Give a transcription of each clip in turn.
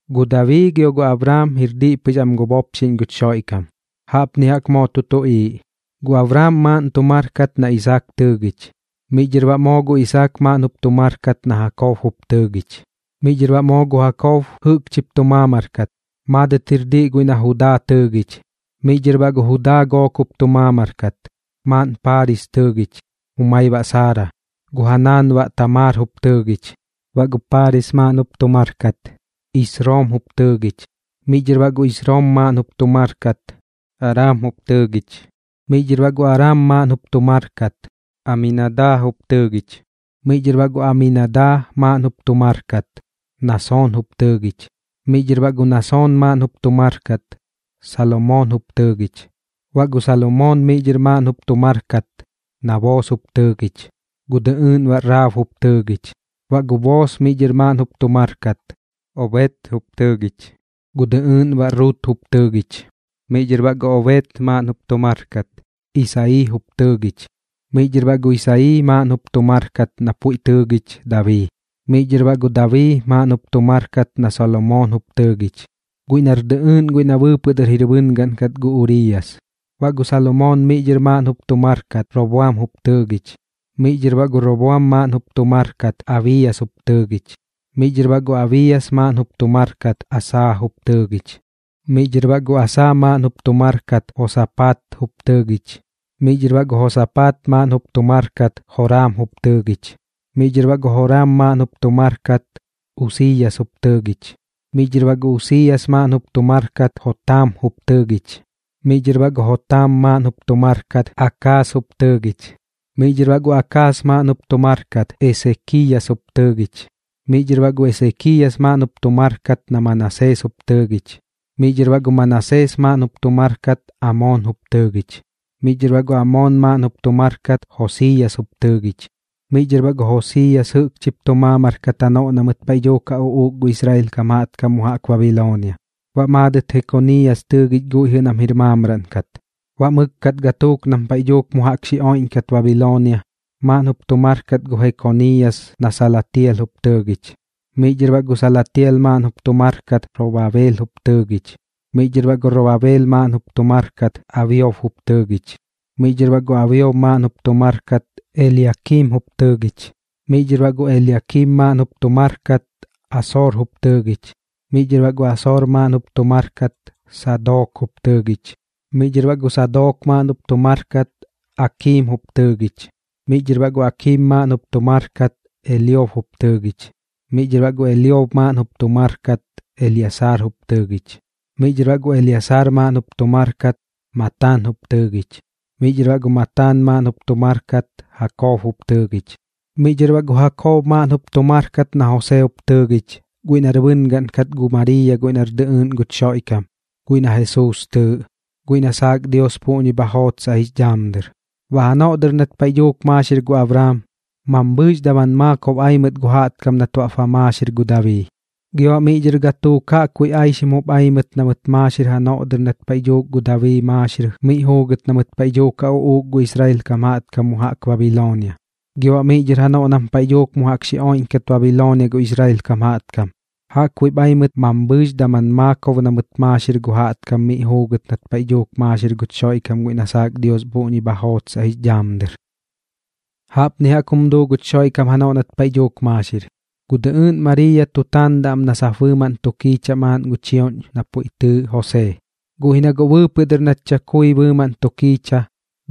Gu Dabii gio gu Abraam jir diꞌ pɨx am gu bopxiꞌñ guch Xoiꞌkam. Jaꞌpni jaꞌk moo tu tuꞌiiꞌ: Gu Abraam maaꞌn tu mar kat na Isaak tɨɨgich. Miꞌ dhɨr baꞌ moo gu Isaak maaꞌn jup tu mar kat na Jakob jup tɨɨgich. Miꞌ dhɨr baꞌ moo gu Jakob jɨꞌkchip tu maamar kat, maadɨt jir diꞌ guiꞌ na Judaa tɨɨgich. Miꞌ dhɨr baꞌ gu Judaa gook jup tu maamar kat, maaꞌn Paaris tɨɨgich, gu jumai baꞌ Saara, gu ja naan baꞌ Tamaar jup tɨɨgich. Baꞌ gu Paaris maaꞌn jup tu mar kat, Isroom jup tɨɨgich. Miꞌ dhɨr baꞌ gu Isroom maaꞌn jup tu mar kat, Araam jup tɨɨgich. Miꞌ dhɨr baꞌ gu Araam maaꞌn jup tu mar kat, Aminadaa jup tɨɨgich. Miꞌ dhɨr baꞌ gu Aminadaa maaꞌn jup tu mar kat, Nasoon jup tɨɨgich. Miꞌ dhɨr baꞌ gu Nasoon maaꞌn jup tu mar kat, Salomoon jup tɨɨgich. Baꞌ gu Salomoon miꞌ dhɨr maaꞌn jup tu mar kat na Boos jup tɨɨgich, gu dɨꞌɨɨꞌn baꞌ Raab jup tɨɨgich. Baꞌ gu Boos miꞌ dhɨr maaꞌn jup tu mar kat, Obed jup tɨɨgich, gu dɨꞌɨɨꞌn baꞌ Rut jup tɨɨgich. Miꞌ dhɨr baꞌ gu Obed maaꞌn jup tu mar kat, Isayii jup tɨɨgich. Miꞌ dhɨr baꞌ gu Isayii maaꞌn jup tu mar kat na puiꞌ tɨɨgich Dabii. Miꞌ dhɨr baꞌ gu Dabii maaꞌn jup tu mar kat na Salomoon jup tɨɨgich, guiꞌ nar dɨꞌɨɨꞌn guiꞌ na bɨɨpɨꞌ dɨr jir bɨngaꞌn kat gu Uriiyas. Baꞌ gu Salomoon miꞌ dhɨr maaꞌn jup tu mar kat, Roboam jup tɨɨgich. Miꞌ dhɨr baꞌ gu Roboam maaꞌn jup tu mar kat, Abiiyas jup tɨɨgich. Miꞌ dhɨr baꞌ gu Abiiyas maaꞌn jup tu mar kat, Asaa jup tɨɨgich. Miꞌ dhɨr baꞌ gu Asaa maaꞌn jup tu mar kat, Josapaat jup tɨɨgich. Miꞌ dhɨr baꞌ gu Josapaat maaꞌn jup tu mar kat, Joraam jup tɨɨgich. Miꞌ dhɨr baꞌ gu Joraam maaꞌn jup tu mar kat, Usiiyas jup tɨɨgich. Miꞌ dhɨr baꞌ gu Usiiyas maaꞌn jup tu mar kat, Jotaam jup tɨɨgich. Miꞌ dhɨr baꞌ gu Jotaam maaꞌn jup tu mar kat, Akaas jup tɨɨgich. Miꞌ dhɨr baꞌ gu Akaas maaꞌn jup tu mar kat, Esekiiyas jup tɨɨgich. Miꞌ dhɨr baꞌ gu Esekiiyas maaꞌn jup tu mar kat na Manasees jup tɨɨgich. Miꞌ dhɨr baꞌ gu Manasees maaꞌn jup tu mar kat, Amoon jup tɨɨgich. Miꞌ dhɨr baꞌ gu Amoon maaꞌn jup tu mar kat, Josiiyas jup tɨɨgich. Miꞌ dhɨr baꞌ gu Josiiyas jɨꞌkchip tu maamar kat janoꞌ na mɨt paiꞌ dhuuk ja uꞌuuk gu Israel kam jaꞌtkam mu jaꞌk Babiloonia. Baꞌ maadɨt Jekoniiyas tɨɨgich guiꞌ jɨꞌ nam jir maamraꞌn kat. Baꞌ mɨkkat gatuuk nam paiꞌ dhuuk mu jaꞌk xi oiꞌñkat Babiloonia, maaꞌn jup tu mar kat gu Jekoniiyas na Salatial jup tɨɨgich. Miꞌ dhɨr baꞌ gu Salatial maaꞌn jup tu mar kat, Robabeel jup tɨɨgich. Miꞌ dhɨr baꞌ gu Robabeel maaꞌn jup tu mar kat, Abiot jup tɨɨgich. Miꞌ dhɨr baꞌ gu Abiot maaꞌn jup tu mar kat, Eliakiim jup tɨɨgich. Miꞌ dhɨr baꞌ gu Eliakiim maaꞌn jup tu mar kat, Asoor jup tɨɨgich. Miꞌ dhɨr baꞌ gu Asoor maaꞌn jup tu mar kat, Sadook jup tɨɨgich. Miꞌ dhɨr baꞌ gu Sadook maaꞌn jup tu mar kat, Akiim jup tɨɨgich. Miꞌ dhɨr baꞌ gu Akiim maaꞌn jup tu mar kat, Eliob jup tɨɨgich. Miꞌ dhɨr baꞌ gu Eliob maaꞌn jup tu mar kat, Eliasaar jup tɨɨgich. Miꞌ dhɨr baꞌ gu Eliasaar maaꞌn jup tu mar kat, Mataan jup tɨɨgich. Miꞌ dhɨr baꞌ gu Mataan maaꞌn jup tu mar kat, Jakob jup tɨɨgich. Miꞌ dhɨr baꞌ gu Jakob maaꞌn jup tu mar kat na Josee jup tɨɨgich, guiꞌ nar bɨngaꞌn kat gu Mariiya guiꞌ nar dɨꞌɨɨꞌn guch Xoiꞌkam guiꞌ na Jesuus tɨɨꞌ, guiꞌ na saak Dios puꞌñi bha jootsaꞌ jix dhaam dɨr. Baꞌ janoꞌ dɨr nat paiꞌ dhuuk maaxir gu Abraam, mambhɨɨx daman maakob ai mɨt gu jaꞌtkam nat baꞌp ba maaxir gu Dabii. Gio baꞌ miꞌ dhɨr gatuuk jaꞌkbuiꞌ aixkam jup ai mɨt na mɨt maaxir janoꞌ dɨr nat paiꞌ dhuuk gu Dabii maaxir miꞌ juugɨt na mɨt paiꞌ dhuuk ja uꞌuuk gu Israel kam jaꞌtkam mu jaꞌk Babiloonia. Gio baꞌ miꞌ dhɨr janoꞌ nam paiꞌ dhuuk mu jaꞌk xi oiꞌñkat Babiloonia gu Israel kam jaꞌtkam, jaꞌkbuiꞌp ai mɨt mambhɨɨx daman maakob na mɨt maaxir gu jaꞌtkam miꞌ juugɨt nat paiꞌ dhuuk maaxir guch Xoiꞌkam guiꞌ na saak Dios puꞌñi bha jootsaꞌ jix dhaam dɨr. Jaꞌpni jaꞌk jum duu guch Xoiꞌkam janoꞌ nat paiꞌ dhuuk maaxir. Gu dɨꞌɨɨꞌn Mariiya tu taandaꞌ am na sap bɨɨmaꞌn tu kiichaꞌ maaꞌn gu chioꞌñ na puiꞌ tɨɨꞌ Josee, guꞌ ji na guꞌ bɨɨpɨꞌ dɨr nat chakui bɨɨmaꞌn tu kiicha,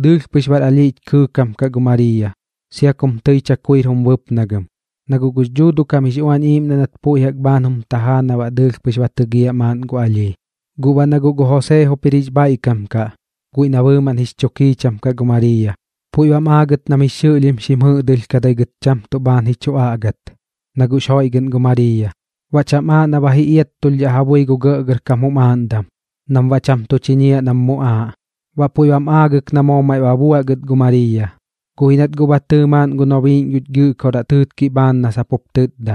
dɨɨlh pɨx bar alhiꞌch kɨɨkam kaꞌ gu Mariiya, sia kum tɨi chakuir jum bɨpnagɨm, na guꞌ gux Dhuuduꞌ kam jix Uañ Iiꞌmdaꞌ nat puiꞌ jaꞌk bhaan jum tajaa na baꞌ dɨɨlh pɨx ba tɨgiaꞌ maaꞌn gu alhii. Guꞌ baꞌ na guꞌ gu Josee jup jir jix bhaiꞌkam kaꞌ, guiꞌ na bɨɨmaꞌn jix chu kiicham kaꞌ gu Mariiya, puiꞌ bam aagɨt nam jix xɨꞌlhim xim jɨꞌdɨlhkadai gɨt cham tuꞌ bhaan ji chu aꞌgat, na guꞌx joiꞌgɨꞌn gu Mariiya, baꞌ cham aaꞌ na ba ji iattulhdhaꞌ ja bui gu gɇꞌgɇrkam jum aaꞌndam, nam baꞌ cham tu chiñiaꞌ nam muꞌaaꞌ. Baꞌ puiꞌ bam aagɨk na moo maiꞌ ba buaꞌ gɨt gu Mariiya, guꞌ ji nat guꞌ ba tɨɨ maaꞌn gu nobiiꞌñ guch Gɨꞌkoraꞌ tɨɨtkiꞌ bhaan na sap jup tɨtda: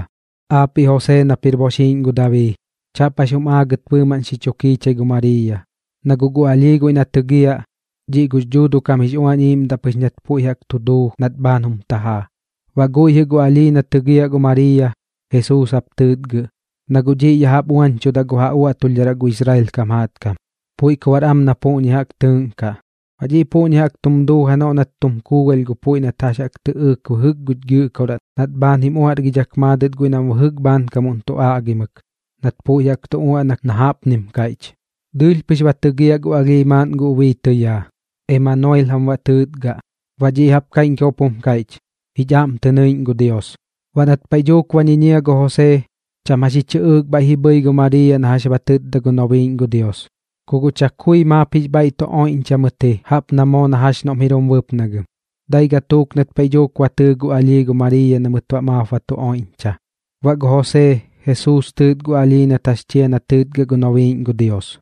―Aapiꞌ Josee nap jir boxiiꞌñ gu Dabii, chaꞌp jax jum aagɨt bɨɨmaꞌn xi chu kiichai gu Mariiya, na guꞌ gu alhii guiꞌ na tɨgiaꞌ, dhiꞌ gux Dhuuduꞌ kam jix Uañ Iiꞌmdaꞌ pɨx nat puiꞌ jaꞌk tu duu nat bhaan jum tajaa. Baꞌ guiꞌ jɨꞌ gu alhii na tɨgiaꞌ gu Mariiya, Jesuus jap tɨɨtgɨꞌ, na guꞌ dhiꞌ ya jaꞌp uañchudaꞌ gu ja uaꞌtulhdharaꞌ gu Israel kam jaꞌtkam. Puiꞌ ku baꞌr am na puꞌñi jaꞌk tɨɨꞌnkaꞌ. Baꞌ dhiꞌ puꞌñi jaꞌk tum duu janoꞌ nat tum kuugalh gu puiꞌ nat jax jaꞌk tɨꞌɨɨk bɨjɨk guch Gɨꞌkoraꞌ nat bhaan jim uaꞌrgidhak maadɨt guiꞌ nam bɨjɨk bhaankam tu aꞌgimɨk, nat puiꞌ jaꞌk tu uaꞌnak na jaꞌpnim kaiꞌch: Dɨɨlh pɨx ba tɨgiaꞌ gu alhii maaꞌn gu ubii tɨyaa. Emanoil jam baꞌ tɨɨtgɨꞌ. Baꞌ dhiꞌ jaꞌp kaiꞌñkam jup jum kaiꞌch: Jich aꞌm tɨ nɨiꞌñ gu Dios. Baꞌ nat paiꞌ dhuuk ba ñiñia gu Josee, cham jax ji chɨꞌɨɨk bhaiꞌp ji bhɨi gu Mariiya na jax ba tɨtda gu nobiiꞌñ gu Dios. Ku guꞌ chakui maap jix bhaiꞌ tu oiꞌñcha mɨt ji jaꞌp na moo na jax noꞌm jir jum bɨpnagɨm. Dai gatuuk nat paiꞌ dhuuk ba tɨɨ gu alhii gu Mariiya na mɨt baꞌ maap ba tu oiꞌñcha. Baꞌ gu Josee, Jesuus tɨɨt gu alhii nat jax chia na tɨɨtgɨꞌ gu nobiiꞌñ gu Dios.